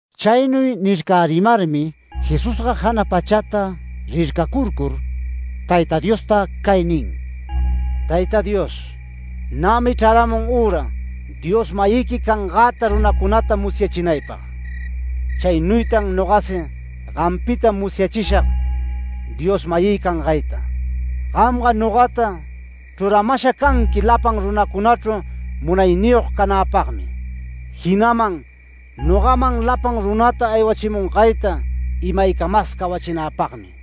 Chaynuy nircärimarmi Jesusga jana pachata rircacurcur Tayta Diosta cay nin: “Tayta Dios, nämi chraramun üra Dios-mayiqui cangäta runacunata musyachinaypag. Chaynuytan nogasi gampita musyachishag Dios-mayï cangayta. Gamga nogata chruramasha canqui lapan runacunachru munayniyog canäpagmi, jinaman nogaman lapan runata aywachimungayta imaycamas cawachinäpagmi.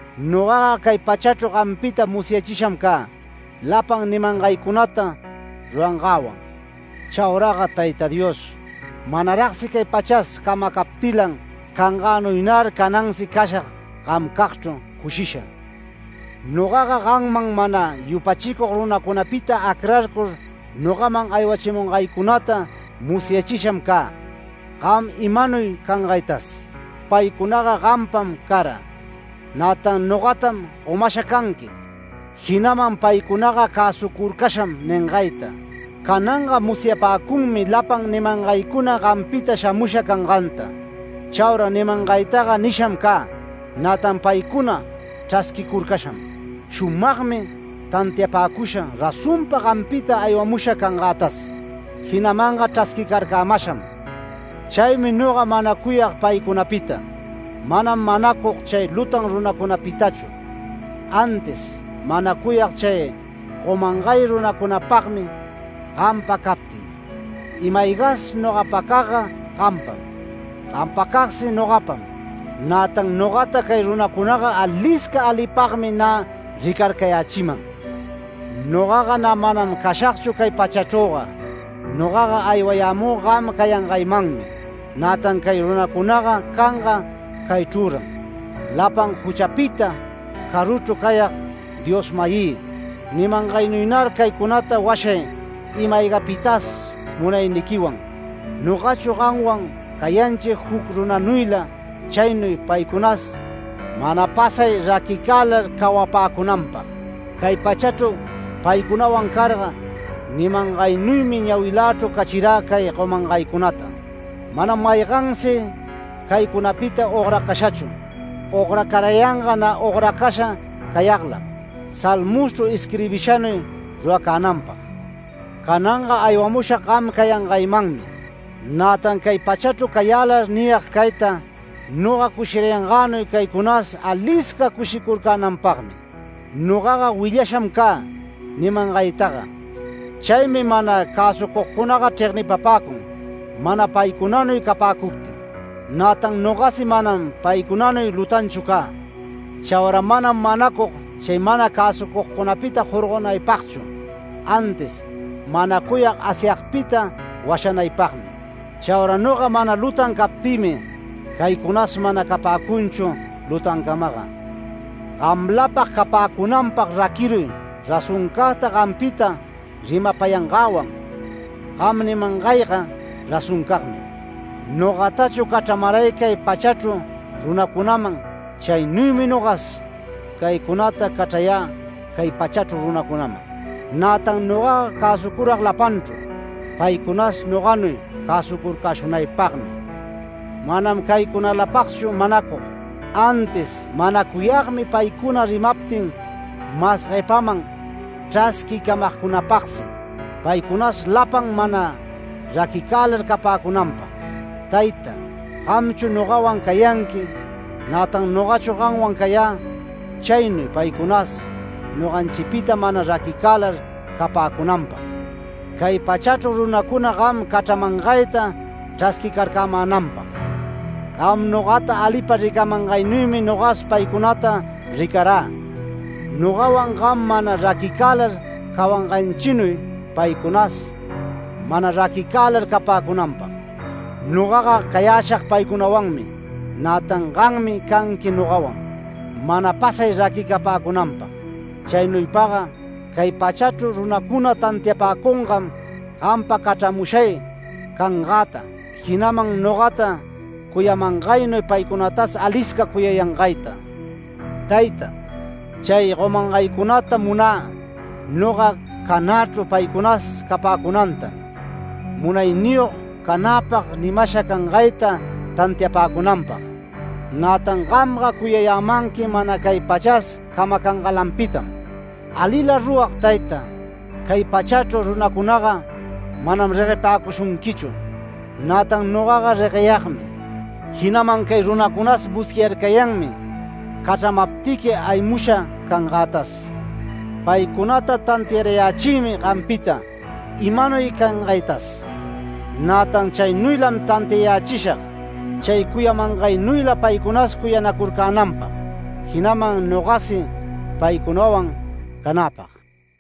Nogaga cay pachachru gampita musyachisham cä, lapan nimangaycunata rurangäwan. Chauraga Tayta Dios, manaragsi cay pachas camacaptilan cangänuynar canansi cashag gamcagchru cushisha. Nogaga gamman mana yupachicug runacunapita acrarcur nogaman aywachimungaycunata musyachisham cä, gam imanuy cangaytas. Paycunaga gampam cara. Nätan nogatam gomasha canqui, jinaman paycunaga cäsucurcasham ningayta. Cananga musyapäcunmi lapan nimangaycuna gampita shamusha canganta. Chaura nimangaytaga nisham cä, nätan paycuna chrasquicurcasham. Shumagmi tantiapäcusha razonpa gampita aywamusha cangätas, jinamanga chrasquicarcämasham. Chaymi noga manacuyag paycunapita. Manam manacug chay lutan runacunapitachu, antis manacuyag chay gomangay runacunapagmi gampa captin. Ima-aygas nogapacagga gampam, gampacagsi nogapam, nätan nogata cay runacunaga alisca alipagmi nä ricarcayächiman. Nogaga nä manam cashagchu cay pachachrüga. Nogaga aywayämü gam cayangaymanmi, nätan cay runacunaga canga caychrüran. Lapan juchapita caruchru cayag Dios-mayï, nimangaynuynar caycunata washay ima-aygapitas munayniquiwan. Nogachu gamwan cayanchi juc runanuyla chaynuy paycunas mana pasay raquicälar cawapäcunanpag. Cay pachachru paycunawan carga, nimangaynuymi ñawilächru cachirä cay gomangaycunata. Manam maygansi caycunapita ogracashachu. Ogracarayanga nä ogracasha cayaglam, Salmoschru isquirbishanuy ruracänanpag. Cananga aywamushag gam cayangaymanmi. Nätan cay pachachru cayälar niyag cayta, noga cushirayangänuy caycunas alisca cushicurcänanpagmi. Nogaga willasham cä nimangaytaga. Chaymi mana cäsucugcunaga chregnipapäcun, mana paycunanuy capäcuptin. Nätan nogasi manam paycunanuy lutanchu cä. Chaura manam manacug, chay mana cäsucugcunapita jorgonaypagchu, antis manacuyag Asyagpita washanaypagmi. Chaura noga mana lutan captïmi, caycunas mana capäcunchu lutancamaga. Gamlapag capäcunanpag raquiruy razoncagta gampita rimapayangäwan. Gam nimangayga razoncagmi. Nogatachu cachramaray cay pachachru runacunam, chaynuymi nogas caycunata cachrayä cay pachachru runacunaman. Nätan nogaga cäsucurag lapanchru, paycunas noganuy cäsucurcäshunaypagmi. Manam caycunalapagchu manacug, antis manacuyagmi paycuna rimaptin mas guepaman chrasquicamagcunapagsi. Paycunas lapan mana raquicälar capäcunanpag. Tayta, gamchu nogawan cayanqui, nätan nogachu gamwan cayä, chaynuy paycunas noganchipita mana raquicälar capäcunanpag, cay pachachru runacuna gam cachramangayta chrasquicarcämänanpag. Gam nogata alipa ricamangaynuymi nogas paycunata ricarä, nogawan gam mana raquicälar cawanganchinuy paycunas mana raquicälar capäcunanpag. Nogaga cayäshag paycunawanmi, nätan gammi canqui nogawan, mana pasay raquicapäcunanpag. Chaynuypaga cay pachachru runacuna tantiapäcungam gampa cachramushay cangäta, jinaman nogata cuyamangaynuy paycunatas alisca cuyayangayta. Tayta, chay gomangaycunata munä noga canächru paycunas capäcunantam, munayniyog canäpag nimasha cangayta tantiapäcunanpag. Nätan gamga cuyayämanqui mana cay pachas camacangalanpitam. Alila rurag Tayta, cay pachachru runacunaga manam reguepäcushunquichu. Nätan nogaga regueyagmi, jinaman cay runacunas musyarcayanmi cachramaptiqui aywamusha cangätas. Paycunata tantiarayächïmi gampita, imanuy cangaytas. Nätan chaynuylam tantiayächishag, chay cuyamangaynuyla paycunas cuyanacurcänanpag, jinaman nogasi paycunawan canäpag”.